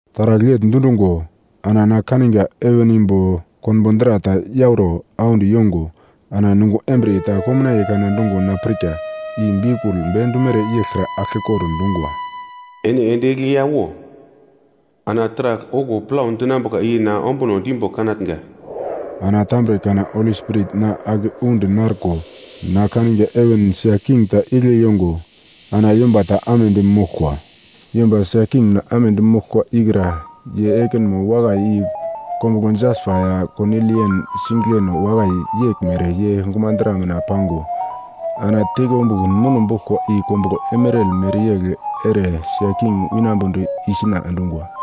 Taragl yegl dundungo, ana na kaniga heven imbo konbo dra ta yauro audi yongo ana nungo embriye ta komnaiye kana dungo na pirka, i biukul bendumere yeglkra aglkekor dungwa, “Ene ende egli ya wo, ana taragl okuwo plau dinambuka i na ombuno dimbo kanatnga.” Ana tambre kana Holi Spirit na ake undi narko na kaniga heven sia king ta igle yongo ana yomba ta amedi moglkwa. Yomba sia king mina amedi moglkwa ikra ye ekinmo wakai i kombuglo jaspa ya konilian singigleno wakai yeglmere ye gumadra mina pango, ana teikombukun muno boglkwa i kombuglo emeral mereyegl ere sia king winambodi isuna endungwa.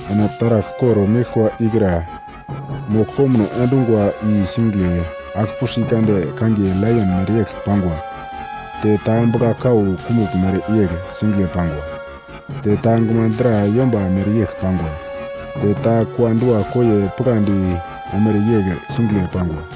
Ana taragl kor-meglkwa ikra mogl komuno endungwa i singigle agl-pusi kande kangiye laion mereyegl pangwa te ta bugla-kau kumugl mereyegl singigle pangwa, te ta gumadra yomba mereyegl pangwa, te ta kua-dua koiye pigladi omere yegl singigle pangwa.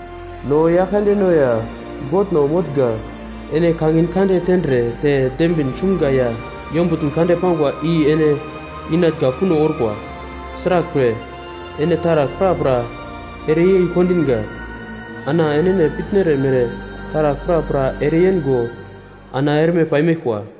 “No Yaglkandeno ya Godno motnga, ene kangin kande tendre te dembin sumga ya yombutn kande pangwa i ene inatnga kuno orkwa. Sraglpre, ene taragl prapra ereyei kondinga, ana enene pitnere mere taragl prapra ereyengo ana erme paimeglkwa.”